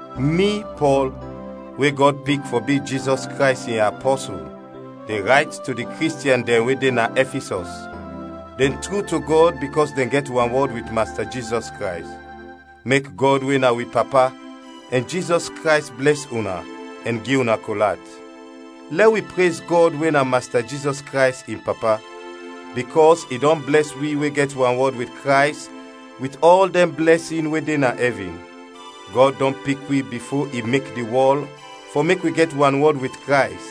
Mi, Pɔl, we Gɔd pik fɔ bi Jizɔs Krays in apɔsul de rayt to di Kristiɛn dɛn we de na Ɛfisɔs, dɛn tru to Gɔd bikɔs dɛn gɛt wanwɔd wit Masta Jizɔs Krays. Mek Gɔd we na wi Papa ɛn Jizɔs Krays blɛs una ɛn gi una kol at. Lɛ wi prez Gɔd we na Masta Jizɔs Krays in Papa, bikɔs i dɔn blɛs wi we gɛt wanwɔd wit Krays wit ɔl dɛn blɛsin we de na ɛvin. Gɔd dɔn pik wi bifo i mek di wɔl fɔ mek wi gɛt wanwɔd wit Krays,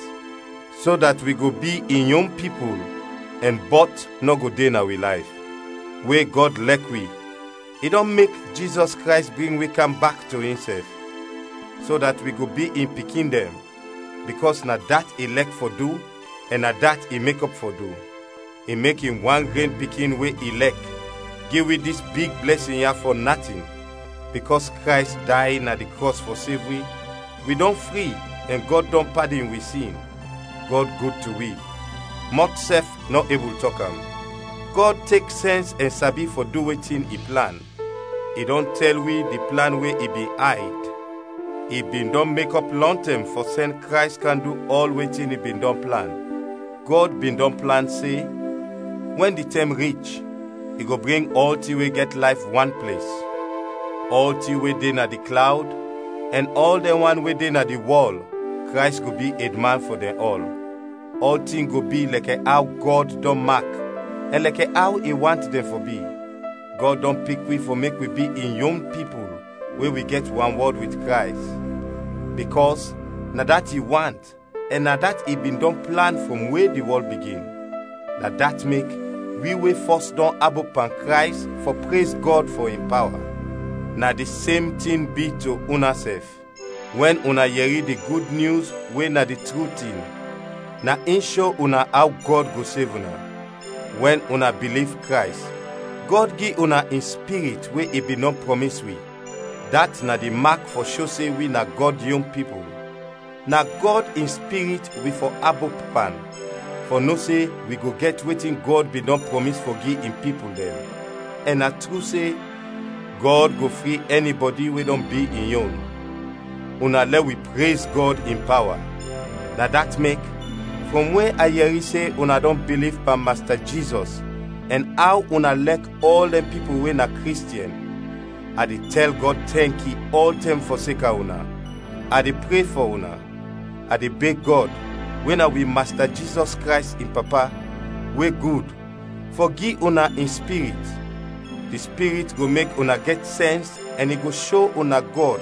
so dat wi go bi in yon pipul ɛn bɔt nɔ go de na wi layf. We Gɔd lɛk wi, i dɔn mek Jizɔs Krays bring wi kam bak to insɛf; so dat wi go bi in pikin dɛn, bikɔs na dat i lɛk fɔ du ɛn na dat i mekɔp fɔ du. I mek in wan gren Pikin we i lɛk, gi wi dis big blɛsin ya fɔ natin. Bikɔs Krays day na di krɔs fɔ sev wi, wi dɔn fri ɛn Gɔd dɔn padin wi sin. Gɔd gud to wi, mɔt sɛf nɔ ebul tɔk am. Gɔd tek sɛns ɛn sabi fɔ du wetin i plan; i dɔn tɛl wi di plan we i bin ayd, i bin dɔn mekɔp lɔntɛm fɔ sɛn Krays kam du ɔl wetin i bin dɔn plan. Gɔd bin dɔn plan se: Wɛn di tɛm rich, i go bring ɔltin we gɛt layf wan ples: ɔltin we de na di klawd ɛn ɔl dɛn wan we de na di wɔl, Krays go bi edman fɔ dɛn ɔl. Ɔltin go bi lɛkɛ aw Gɔd dɔn mak ɛn lɛkɛ aw i want dɛn fɔ bi. Gɔd dɔn pik wi fɔ mek wi bi in yon pipul we wi gɛt wanwɔd wit Krays, bikɔs na dat i want ɛn na dat i bin dɔn plan frɔm we di wɔl bigin. Na dat mek wi we fɔs dɔn abop pan Krays fɔ prez Gɔd fɔ in pawa. Na di sem tin bi to unasɛf, wɛn una yɛri di Gud Nyus we na di tru tin, na in sho una aw Gɔd go sev una. Wɛn una biliv Krays, Gɔd gi una in Spirit we i bin dɔn prɔmis wi, dat na di mak fɔ sho se wi na Gɔd yon pipul. Na Gɔd in Spirit wi fɔ abop pan fɔ no se wi go gɛt wetin Gɔd bin dɔn prɔmis fɔ gi in pipul dɛn, ɛn na tru se: Gɔd go fri ɛnibɔdi we dɔn bi in yon. Una lɛ wi prez Gɔd in pawa! Na dat mek, frɔm we a yɛri se una dɔn biliv pan Masta Jizɔs ɛn aw una lɛk ɔl dɛn pipul we na Kristiɛn, a de tɛl Gɔd tɛnki ɔltɛm fɔseka una, a de pre fɔ una. A de beg Gɔd, we na wi Masta Jizɔs Krays in Papa, we gud, fɔ gi una in Spirit. Di Spirit go mek una gɛt sɛns ɛn i go sho una Gɔd,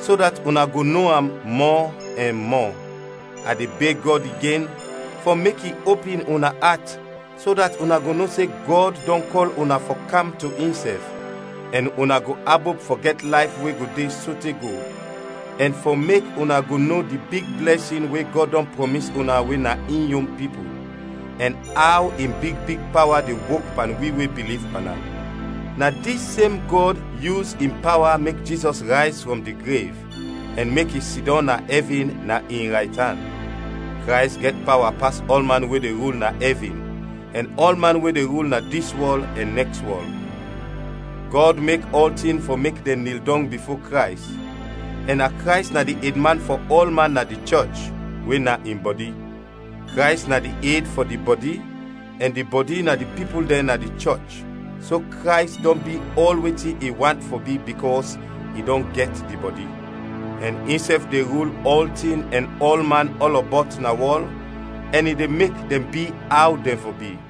so dat una go no am mɔ ɛn mɔ. A de beg Gɔd igen fɔ mek i opin una at so dat una go no se Gɔd dɔn kɔl una fɔ kam to insɛf, ɛn una go abop fɔ gɛt layf we go de sote go, ɛn fɔ mek una go no di big blɛsin we Gɔd dɔn prɔmis una we na in yon pipul, ɛn aw in big big pawa de wok pan wi we biliv pan am. Na dis sem Gɔd yus in pawa mek Jizɔs rayz frɔm di grev, ɛn mek i sidɔm na ɛvin na in raytan. Krays gɛt pawa pas ɔlman we de rul na ɛvin, ɛn ɔlman we de rul na dis wɔl ɛn nɛks wɔl. Gɔd mek ɔltin fɔ mek dɛn nil dɔng bifo Krays, ɛn na Krays na di edman fɔ ɔlman na di chɔch, we na in bɔdi. Krays na di ed fɔ di bɔdi ɛn di bɔdi na di pipul dɛn na di chɔch, so Krays dɔn bi ɔl wetin i want fɔ bi bikɔs i dɔn gɛt di bɔdi. Ɛn insɛf de rul ɔltin ɛn ɔlman ɔlɔbɔt na wɔl ɛn i de mek dɛn bi aw dɛn fɔ bi.